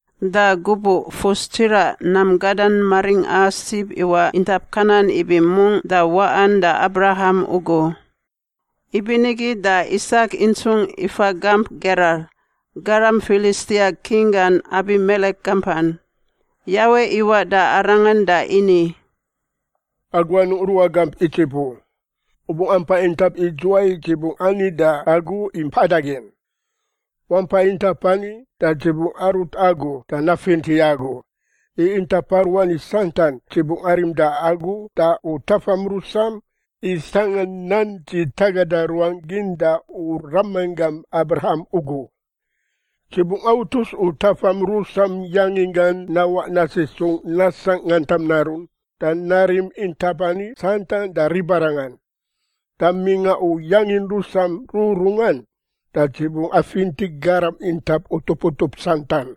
Da gubuꞌ fus tsiraꞌ nam gada maringꞌa sib iwaꞌ intap Kanan ibi mungꞌ da waꞌan da Abraham ugu. Ibinigi da Isak intsungꞌ ifa gamp Gerar, garam Filistia king gan Abimelek gampan. Yawe iwaꞌ da arangan da ini, “Agu anungꞌ ruꞌa gamp Idzip u. U bungꞌ ampai intap idzuwai Dzi bungꞌ ani da agu i mpada gin. Wampa intap ani da Dzi bungꞌ arut agu da nafinti agu. I intap aruani santan Dzi bungꞌ arim da agu da u tafam rusam i sangꞌa nan Dzi tagada ruangꞌ gin da u ramanggam Abraham ugu. Dzi bungꞌ autus u tafam rusam yanginggan nawaꞌ nasisungꞌ nasangꞌ ngantam narun da narim intap ani santan da ribarangan. Da mingꞌa u yangin rusam rururungan da Dzi bungꞌ afinti garam intap utup utup santan,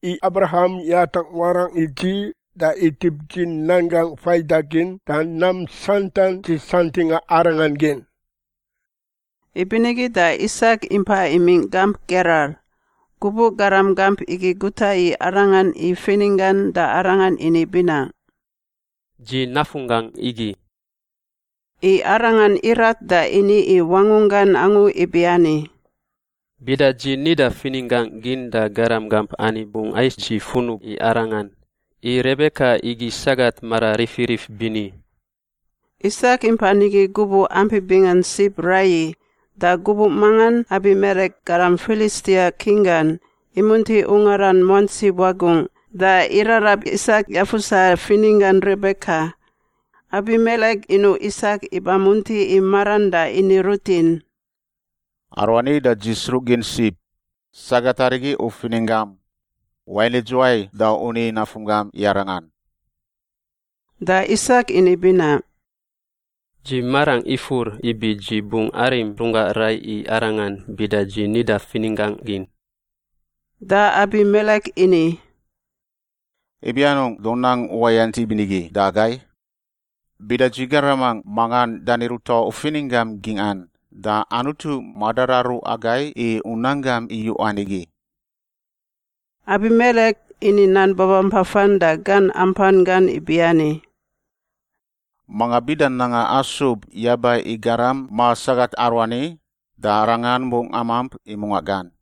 i Abraham yatangꞌ warangꞌ i Dzi da itip Dzi nan gangꞌ faidagin da nam santan Dzi santingꞌa arangan gin.” Ibinigi da Isak impa imingꞌ gamp Gerar. Gubuꞌ garam gamp igi guta i arangan i fininggan da arangan ini binaꞌ, “Dzi nafunggangꞌ igi.” I arangan irat da ini i wangunggan angu ibiani, “Bida dzi nida fininggangꞌ gin da garam gamp ani bungꞌ ais dzi funub i arangan, i Rebeka igi sagat mara rifirif bini.” Isak impa nigi gubuꞌ ampi bingan sib raiyi, da gubuꞌ mangan Abimelek, garam Filistia king gan, imunti ungaran muantsi wagungꞌ da irarab Isak yafusa fininggan Rebeka. Abimelek inuꞌ Isak iba munti i maran da ini rutin, “Aruani da dzi sruꞌgin sib. Sagat arigi u fininggam. Wain idzuwai da u ni nafunggam i arangan?” Da Isak ini binaꞌ, “Dzi marangꞌ ifur ibi dzi bungꞌ arim runggangꞌ rai i arangan bida dzi nida fininggangꞌ gin.” Da Abimelek ini, “Ibi anungꞌ da u nang uwayant ibinigi da agai? Bida dzi garamangꞌ mangan dani ruta u fininggam gingꞌan, da Anutu madararu agai i u nan gam iyuꞌan igi.” Abimelek ini nan babampafan da gan ampan gan ibiani, “Manga bida nanga asub yaba i garam ma sagat aruani da arangan bungꞌ amamp i mungaꞌ gan.”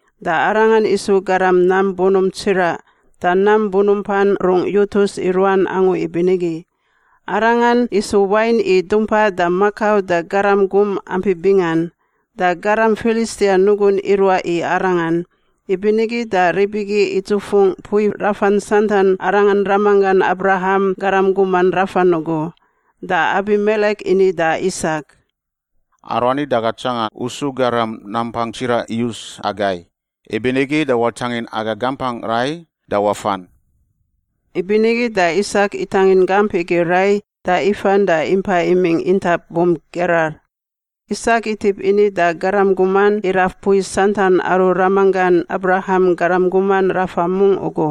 da arangan isu garam nam bunump tsiraꞌ da nam bunumpan rungꞌ yutus i ruan angu ibinigi. Arangan isu wain i dumpa da makau da garam gum ampi bingan, da garam Filistia nugun iruaꞌ i arangan. Ibinigi da rib igi idzufungꞌ mpui rafan santan arangan ramanggan Abraham garam guman rafan ugu. Da Abimelek ini da Isak, “Aruani da aga tsanga u su garam nampangꞌ tsiraꞌ iyus agai, ibinigi da watangin aga gampangꞌ rai da wafan.” Ibinigi da Isak itangin gamp igi rai da ifan da impa imingꞌ intap bump Gerar. Isak itip ini da garam guman iraf mpui santan aru ramanggan Abraham garam guman rafa mungꞌ ugu.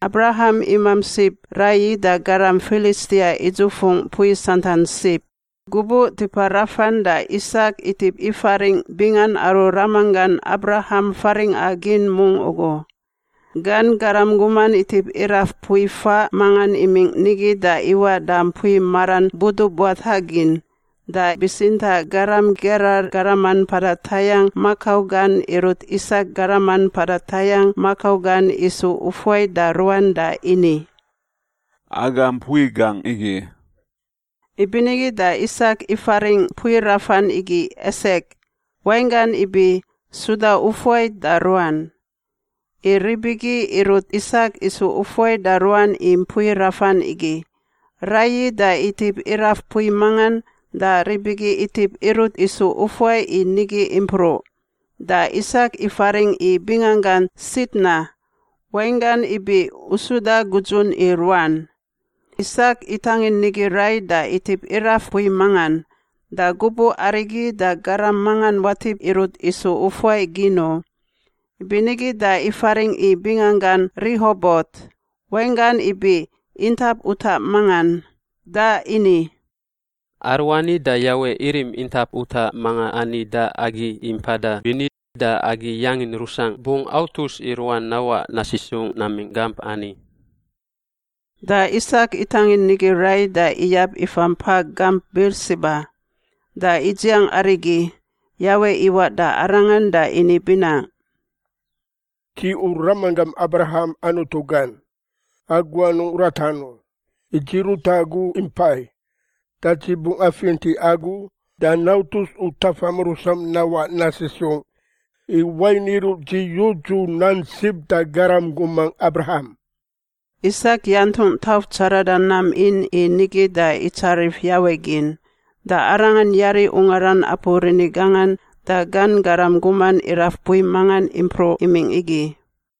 Abraham imamp sib raiyi da garam Filistia idzufungꞌ mpui santan sib. Gubuꞌ tipa rafan da Isak itip ifaringꞌ bingan aru ramanggan Abraham faringꞌa gin mungꞌ ugu. Gan garam guman itip iraf mpui faꞌ mangan imingꞌ nigi da iwaꞌ da mpui maran budubuatagin. Da bitsintaꞌ garam Gerar garaman mpada tayangꞌ makau gan irut Isak garaman mpada tayangꞌ makau gan isu ufuai da ruan da ini, “Aga mpui gangꞌ igi.” Ibinigi da Isak ifaringꞌ mpui rafan igi Esek (wainggan ibi suda ufuai da ruan), i rib igi irut Isak isu ufuai da ruan i mpui rafan igi. Raiyi da itip iraf mpui mangan da rib igi itip irut isu ufuai i nigi impruꞌ, da Isak ifaringꞌ i binganggan Sitna (wainggan ibi usuda gudzun i ruan). Isak itangin nigi rai da itip iraf mpui mangan. Da gubuꞌ arigi da garam mangan watip irut isu ufuai gin u, ibinigi da ifaringꞌ i binganggan Rihobot (wainggan ibi intap utaꞌ mangan) da ini, “Aruani da Yawe irim intap utaꞌ manga ani da agi i mpada bini da agi yangin rusangꞌ bungꞌ autus i ruan nawaꞌ nasisungꞌ namingꞌ gamp ani.” Da Isak itangin nigi rai da iyab ifa mpa gamp Birsiba. Da idziang arigi Yawe iwaꞌ da arangan da ini binaꞌ, “Dzi u ramanggam Abraham Anutu gan. Agu anungꞌ ratan u, i Dzi rut agu impai. Da Dzi bungꞌ afinti agu da nautus u tafam rusam nawaꞌ nasisungꞌ, i wain iruꞌ dzi yudzu nan sib da garam gumangꞌ Abraham.” Isak yantungꞌ tauf tsarada nam in i nigi da itsarif Yawe gin. Da arangan yari ungaran apu rini gangan da gan garam guman iraf mpui mangan impruꞌ imingꞌ igi.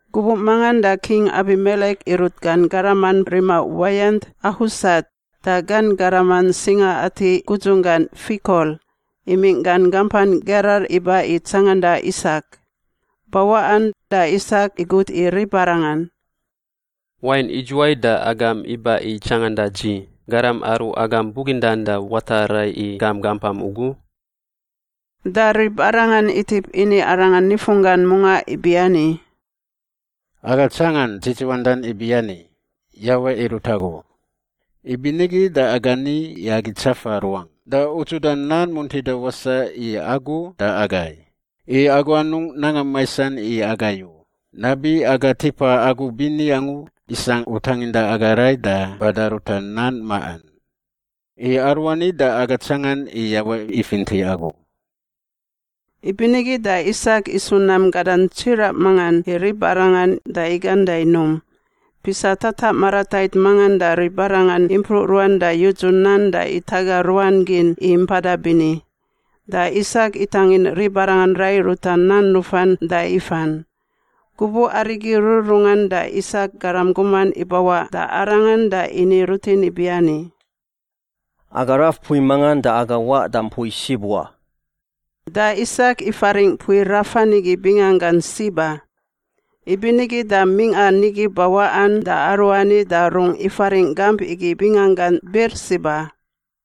Gubuꞌ mangan da King Abimelek irut gan garaman rima uwayant, Ahusat, da gan garaman singa-ati gudzunggan, Fikol, imingꞌ gan gampan Gerar iba i tsanganda Isak. Bawaꞌan da Isak igut i ribarangan, “Wain idzuwai da agam iba i tsanganda dzi, garam aru agam bugindan da wata rai i gam gampam ugu?” Da ribarangan itip ini arangan nifunggan mungaꞌ ibiani, “Aga tsangan dzidziwandan ibiani, Yawe irut agu, ibinigi da aga ni i agi tsafa ruangꞌ da udzuda nan muntida wasaꞌ i agu da agai, i agu anungꞌ nanga maisan i agai u, nabi aga tipa agu bini angu isangꞌ u tanginda aga rai da bada ruta nan maꞌan. I aruani da aga tsangan i Yawe ifinti agu.” Ibinigi da Isak isu nam gadan tsiraꞌ mangan i ribarangan da igan da inum. Pisa tataꞌ maratait mangan da ribarangan impruꞌ ruan da yudzu nan da itaga ruan gin i mpada bini. Da Isak itangin ribarangan rai ruta nan nufan da ifan. Gubuꞌ arigi rururungan da Isak garam guman ibawaꞌ da arangan da ini rutin ibiani, “Aga raf mpui mangan da aga waꞌ da mpui sib wa.” Da Isak ifaringꞌ mpui rafan igi binganggan Siba. Ibinigi da mingꞌa nigi bawaꞌan da aruani da rungꞌ ifaringꞌ gamp igi binganggan Birsiba.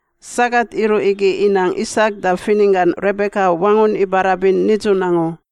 Sagat iruꞌ igi inang Isak da fininggan Rebeka wangun ibarabin nidzun angu.